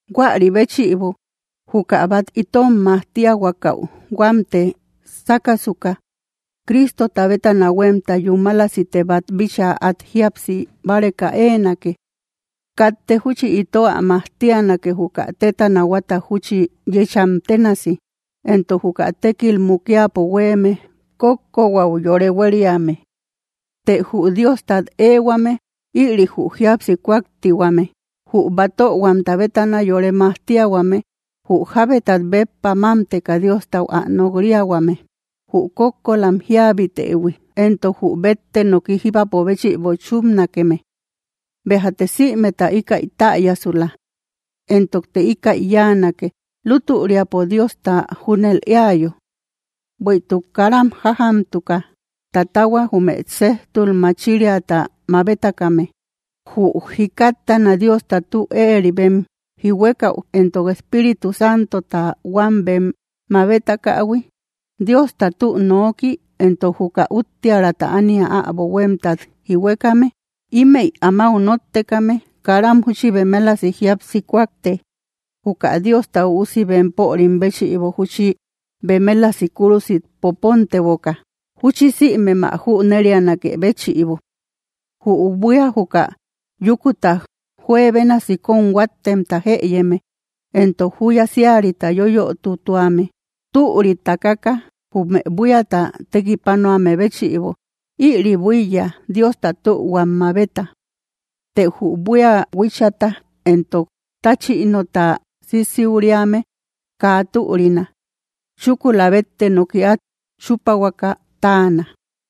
Huäri béchïbo, juka bát itom majtiahuakau huamte sákasuka, Cristota bétana huémta yúmalasite bát bíchaa át jíapsi báreka éenake. Katte júchi ito ä majtianake, juka téta nahuata júchi yecham ténasi entok juka tekil mukiapo hueme kókko huaú yore hueriame. Të jü Diostat éehuame ïri jü jíapsi kúaktihuame, jü batöhuamta bétana yore majtiahuame, jü jábetat béppa mámteka Diostau ä nok‑riahuame, jü kókkolam jíabitëhui, entok jü bette noki jíbapo béchïbo chúpanakeme. Béjate sïmeta íkäi täyasula. Entokte íkäi yáanake, lútüriapo Diosta júnel éayo. Bueïtuk karam jájamtuka tatahua, jume séjtul machiriata mabetakame, jü jikattana Diosta tü éeri bem jihuekäu entok Espíritu Santota huam bem mabetakähui, Diosta tü noki entok juka úttiäraata ánia äbo huémtat jihuekame. Ímëi amáu nóttekame karam júchi bemelasi jíapsi kúakte, juka Diosta Üusi bempörim béchïbo júchi bemelasi kúrusit poponteboka, júchi sïmem ä junnerianakë béchïbo. Jü buía juka yúkuta juebénasi kóm huáttemta jëyeme, entok júya síarita yoyötutuame, türi takaka jume buíata tekipanuame béchïbo, ïri buíya Diosta tühuam mabeta. Të jü buía huíchata entok táchïnota sisiuriame kaa türina; chúkula bette noki át chúpahuaka táana.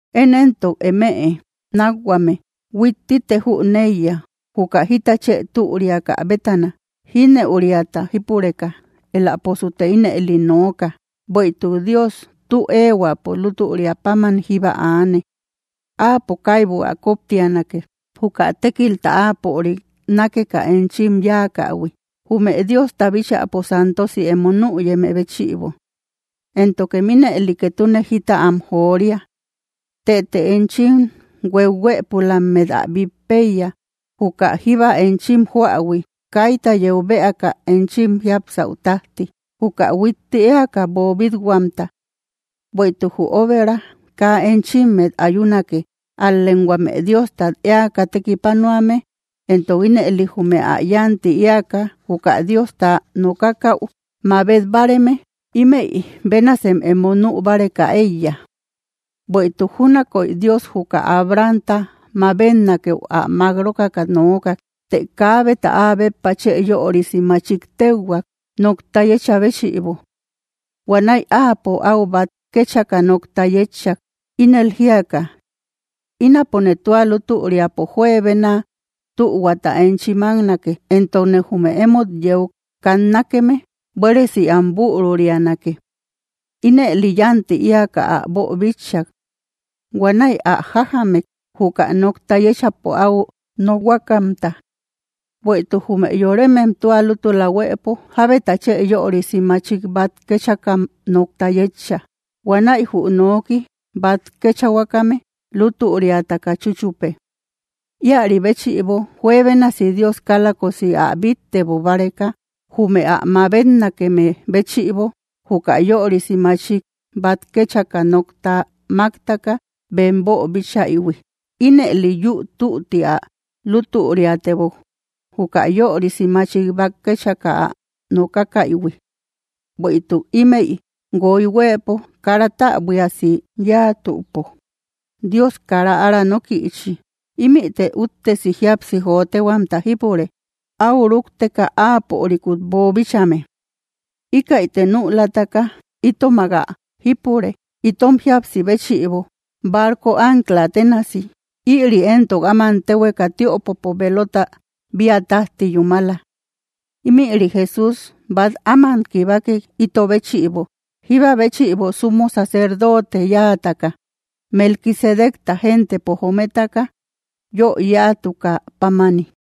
Én éntok, eme nákhuame, huittite jüneiya juka jita chë türiaka bétana, jínëuriata jípureka, éläposute ínëli nooka. Bueïtuk Dios tü éehuäpo lútüria páman jíba aane; áapo kaibu ä koptianake, juka tékilta áapörik nákeka enchim yáakähui, jume Diosta bíchäpo santosi emo nüyeme béchïbo; éntokem ínëli ketune jita am joria. Tëte enchim hueuhuëpulammet ä bít péiya, juka jíba enchim joähui kaita yeu bëaka enchim jiápsau tájti, juka huitti éaka boobit-huamta. Bueïtuk jü óbera kaa enchimmet ayunake, ál‑lem huame Diostat éaka tekipanuame entok ínëli jume yánti éaka juka Diosta nokakäu mabet báareme. Ímëi bénasem emo nü báreka éiya. Bueïtuk júnakoy Dios juka Abrahamta mabetnakëu ä mák rókaka nookak. Të kaabeta áa béppa chë yörisi machik téuhuak, nokta yéchä béchïbo. Huanäi áapo áu bát kéchaka nokta yétchak, ínel jíaka: “Ínapone tua lútüriapo juebena tühuata enchi máknake, entokne jume emót yeu katnakeme buéresi am bürurianake.” Ínëli yánti éaka ä boobíchaïhuik. Huanäi ä jájamek, juka nokta yéchapo áu nokhuakamta. Bueïtuk jume yoremem tua lútula huëpo jábeta chë yörisi machik bát kéchakam nokta yéecha. Huanäi jü noki bát kéchahuakame lútüriataka chúchupe. Íäri béchïbo, juebénasi Dios kálakosi ä bittebo báreka, jume ä mabetnakeme béchïbo juka yörisi machik bát kéchaka nokta máktaka bem boobíchaïhui, ínëli yúu tütti ä lútüriatebok, juka yörisi machik bát kéchaka ä nokakaïhui. Bueïtuk ímëi guoy huëpo kara täbuiasi yáatüpo, Dios kara ára nókïchi. Ímïte úttesi jíapsi jóotehuamta jípure, áu rúkteka áapörikut boobíchaïhuime. Íkäite nülataka itomak ä jípure itom jíapsi béchïbo, barco ancla tenasi. Ïri éntok áman téhueka tiöpopo velota bia tájti yúmala. Ímïri Jesús bát áman kibakek ito béchïbo, jíba béchïbo sumo sacerdote yáataka, Melquisedecta gentepo jometaka yö yáatukä pámani.